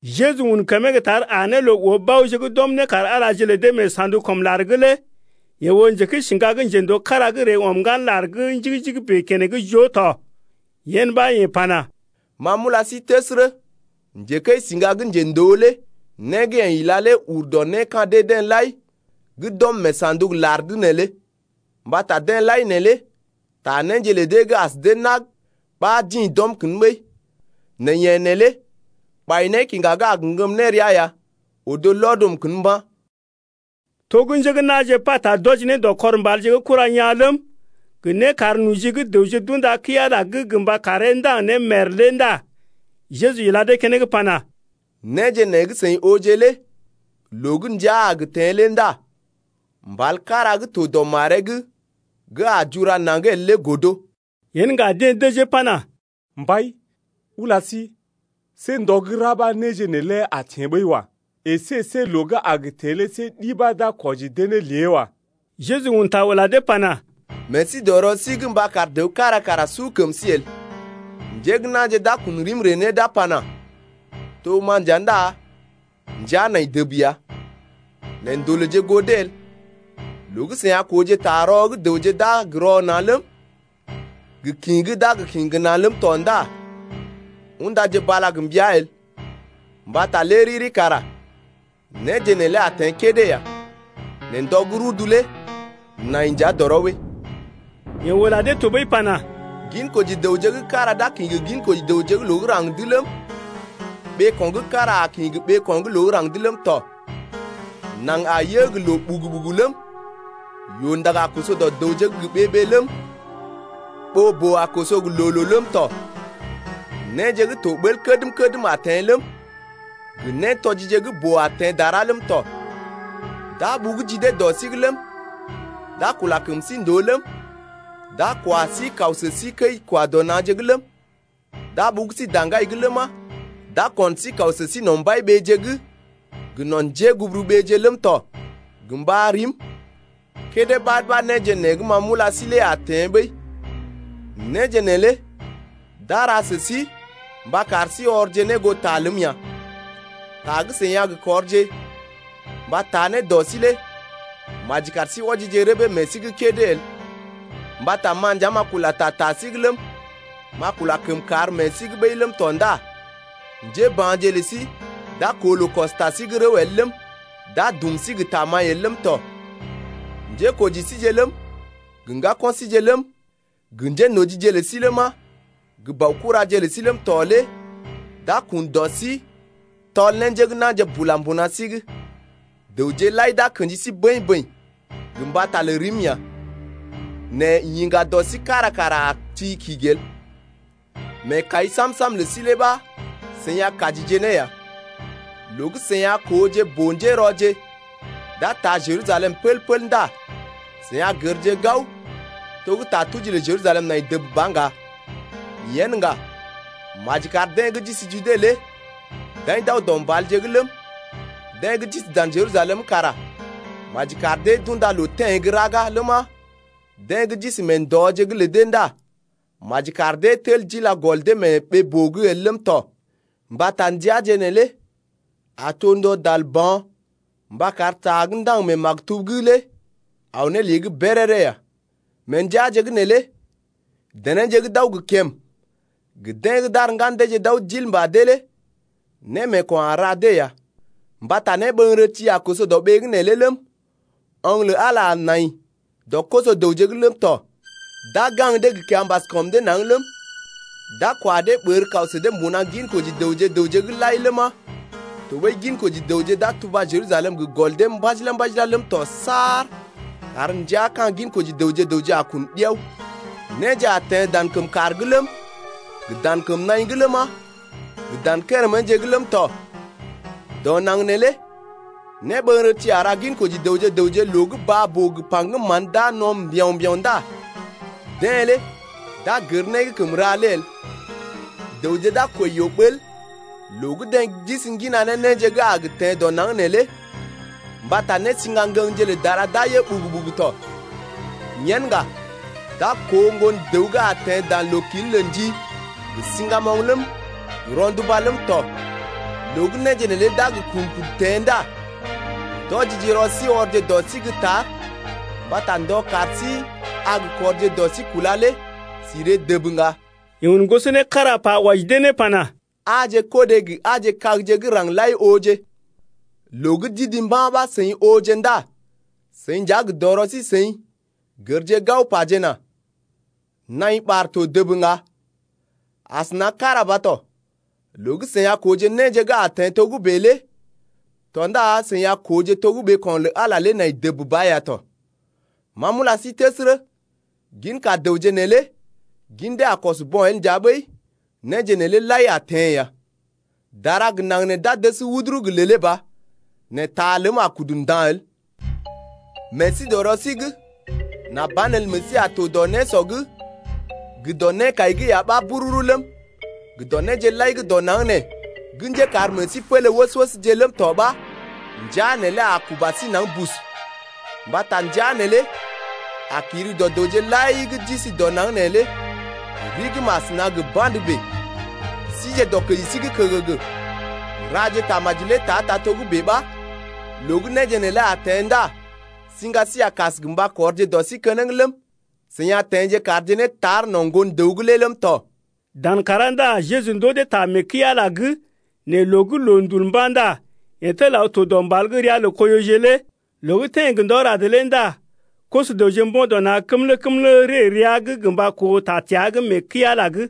Jeju un kəmee gə́ tar aa ne loo oo baoje gə́ d’ɔm nékar-Alaje lə dee mee sa̰duk-kɔm-lar’g lé. Yeḛ oo njekəisiŋga gə́ njendoo kára gə́ ree ɔm ŋgan lar gə́ njigi-njigi bèe keneŋ joo tɔ. Yen ɓa yeḛ pana: Ma m’ula sí təsərə, njekəisiŋga gə́ njendoo lé né gə́ yeḛ ila lé ur dɔ né ka̰ dee-deḛ lai gə́ d’ɔm mee sa̰duk-lar’g neelé, mbata deḛ lai neelé ta néje lə dee gə́ as dee nag ɓa d’ḭ d’ɔm kən ɓəi, nɛ yeḛ neelé ɓai nékiŋga gə́ a gə ŋgəm ne rəa ya odo lɔd ɔm kən mba̰. To gə́ njé gə́ na̰je pata d’wɔji ne dɔ kɔr mbalje gə́ kura yaa̰ ləm, gə nékarnoji gə́ dəwje d’unda kəi-Ala’g gə mba karee ndaŋg ne mèr lé ndá Jeju ila dee keneŋ pana: Néje nee gə́ seḭ ooje lé loo gə́ ndəa a gə teḛ lé ndá mbal kára gə́ to dɔ maree’g gə́ a lal jura naŋg el lé godo. Yen ŋga deḛ dəjee pana: Mbai, ula sí, see ndɔ gə́ ra ɓa néje neelé a teḛ ɓəi wa. Esé see loo gə́ a gə teḛ lé see ɗi ɓa d’a kwɔji dee ne lée wa. Jeju un ta ula dee pana: Meḛ sí dɔ rɔ sí’g mba kar dəw kára kara su kəm sí el. Njé gə́ na̰je d’a kun rim ree ne d’a pana: To ma nja ndá ndəa nai dəb ya. Nɛ ndolèje goo dee el. Loo gə́ seḭ a kooje ta rɔ gə́ dəwje d’a gə rɔ na̰ ləm, gə kḭ gə́ d’a gə kḭ gə na̰ ləm tɔ ndá undaje bala gə mbəa el, mbata lé riri kara néje neelé a teḛ kédé ya. Nɛ ndɔ gə́ rudu lé nai nja dɔrɔ ɓəi. Yeḛ ula dee tɔɓəi pana: Ginkoji dəwje gə́ kára d’a kḭ gə ginkoji dəwje gə́ loo gə́ raŋg’d ləm, ɓeeko̰ gə́ kára a kḭ gə ɓeeko̰ gə́ loo gə́ raŋg’d ləm tɔ. Naŋg a yə gə loo ɓugu-ɓugu ləm, yoo-ndag a koso dɔ dəwje’g gə ɓee-ɓee ləm, ɓoo-boo a koso gə loo-loo ləm tɔ. Néje gə́ to ɓəl kədm-kədm a teḛ ləm, gə nétɔjije gə́ boo a teḛ dara ləm tɔ. D’a ɓugu ji dee dɔ sí’g ləm, d’a kula kəm sí ndòo ləm, d’a kwa sí kaw sə sí kəi-kwa-dɔ-na̰je’g ləm, d’a ɓugu sí daŋgai’g ləma, d’a kon sí kaw sə sí no̰ mbai-ɓeeje’g gə no̰ njéguburuɓeeje’g ləm tɔ gə mba rim, kédé ɓad ɓa néje nee gə́ ma m’ula sí lé a teḛ ɓəi. Néje neelé d’a ra sə sí mba kar sí ɔrje ne goo ta ləm ya. Ta gə́ seḭ a gə kɔrje mba taa ne dɔ sí lé maji kar sí wɔjije rəbee meḛ sí’g kédé el. Mbata ma nja m’a kula ta ta sí’g ləm, m’a kula kəmkàr meḛ sí’g ɓəi ləm tɔ ndá njéba̰je lə sí d’a koo loo kɔs ta sí’g rəw el ləm, d’a dum sí gə tamaḭ el ləm tɔ. Njékoji síje ləm, gə ŋgako̰ síje ləm, gə njénojije lə sí ləma, gə baokuraje lə sí ləm tɔ lé d’a kun dɔ sí, tɔl ne njé gə́ na̰je bula mbuna sí’g. Dəwje lai d’a kḛji sí bəḭ-bəḭ gə mbata lə rim ya. Nɛ yiŋga dɔ sí kára kara a ti kigi el. Meekai sam-sam lə sí ɓa seḭ a kajije ne ya. Loo gə́ seḭ a kooje boo-njérɔje d’a taa Jerusalem pəl-pəl ndá seḭ a gərje gao to gə́ ta tuji lə Jerusalem nai dəb ba ŋga. Yen ŋga, maji kar deḛ gə́ d’isi Jude lé d’aḭ d’aw dɔ mbalje’g ləm, deḛ gə́ d’isi dan Jerusalem’g kara maji kar dee d’unda loo teḛ gə́ raga ləma, deḛ gə́ d’isi mee ndɔje’g lə dee ndá maji kar dee tel d’ila gɔl dee mee ɓee-boo’g el ləm tɔ. Mbata ndəaje neelé a to ndɔ dal ba̰ mba kar ta gə́ ndaŋg mee maktub’g lé aw ne lée’g béréré ya. Mee ndəaje’g neelé denéje gə́ d’aw gə kèm gə deḛ gə́ d’ar ŋgan deeje d’aw d’il mbà dee lé némeeko̰ a ra dee ya. Mbata néɓəŋgərəti a koso dɔ ɓee’g neelé ləm, oŋg lə Ala a nai dɔ koso-dəwje’g ləm tɔ. D’a gaŋg dee gə ta kiambas kɔm dee naŋg ləm, d’a kwa dee ɓər kaw sə dee mbuna ginkoji dəwje gə raŋg’g lai ləma, tɔɓəi ginkoji dəwje d’a tuba Jerusalem gə gɔl dee mbajila-mbajila ləm tɔ saar kar ndəa ka̰ ginkoji dəwje gə raŋg a kun ɗiao. Néje a teḛ dan kəm kàr’g ləm, gə dan kəm naḭ’g ləma, gə dan kéréméje’g ləm tɔ. Dɔ naŋg neelé néɓəŋgərəti a ra ginkoji dəwje gə raŋg loo gə́ baa-boo gə paŋgəm mán d’a no̰ mbiao̰-mbiao̰ ndá deḛ lé d’a gər né gə́ kəm ra lé el. Dəwje d’a kwəi yoo-ɓəl loo gə́ deḛ d’isi ŋgina ne néje gə́ a gə teḛ dɔ naŋg neelé, mbata nésḭgangə̰gje lə dara d’a yə ɓugu-ɓugu tɔ. Yen ŋga d’a koo Ŋgon-dəw gə́ a teḛ dan loo-kil’g lə ndi gə siŋgamoŋ ləm, gə rɔnduba ləm tɔ. Loo gə́ néje neelé d’a gə kun kudu teḛ ndá ndɔjije rɔ sí ɔrje dɔ sí gə́ tar mbata ndɔ kar sí a gə kɔrje dɔ sí kúla lé sí ree dəb ŋga. Yeḛ un goso né kára pa wɔji dee ne pana: Aaje kodé gə aaje kagje gə́ raŋg lai ooje. Loo gə́ d’idi mba̰ ɓa seḭ ooje ndá seḭ nja gə dɔrɔ sí seḭ gərje gao pajena: Naḭ ɓar to dəb ŋga. Asəna kára ba tɔ, loo gə́ seḭ a kooje néje gə́ a teḛ togə́bè lé tɔ ndá seḭ a kooje to gə́ ɓeeko̰ lə Ala lé nai dəb ba ya tɔ. Ma m’ula sí təsərə, ginka dəwje neelé gin dee a kɔs bo̰ el nja ɓəi néje neelé lai a teḛ ya. Dara gə naŋg nee d’a dəs wuduru gə lèlé ba, nɛ ta ləm a kudu nda̰ el. Meḛ sí dɔ rɔ sí’g nà banelə meḛ sí a to dɔ nésɔ’g gə dɔ nékai’g ya ɓa bururu ləm, gə dɔ néje lai gə́ dɔ naŋg nee gə́ njékar meḛ sí pélé wəs-wəsje ləm tɔ ɓa ndəa neelé a kuba sí naŋg bus. Mbata ndəa neelé a kiri dɔ dəwje lai gə́ d’isi dɔ naŋg neelé rigim asəna gə ba̰də bèe. Sije dɔkəji sí’g kəgəgə, raje tamaji lé ta-ta togə́bè ɓa loo gə́ néje neelé a teḛ ndá siŋga sí a kas gə mba kɔrje dɔ sí keneŋ ləm, seḭ a teḛ kaarje ne tar no̰ Ŋgon-dəw’g lé ləm tɔ. Dan kàrá ndá Jeju ndoo dee ta mee kəi-Ala’g, nɛ loo gə́ loondul mba̰ ndá yeḛ tel aw to dɔ mbal gə́ ria lə Koiyoje lé. Loo gə́ teḛ gə ndɔ rad lé ndá koso-dəwje mbo̰ dɔ na̰ kəmlə-kəmlə ree rəa gə mba koo ta təa’g mee kəi-Ala’g.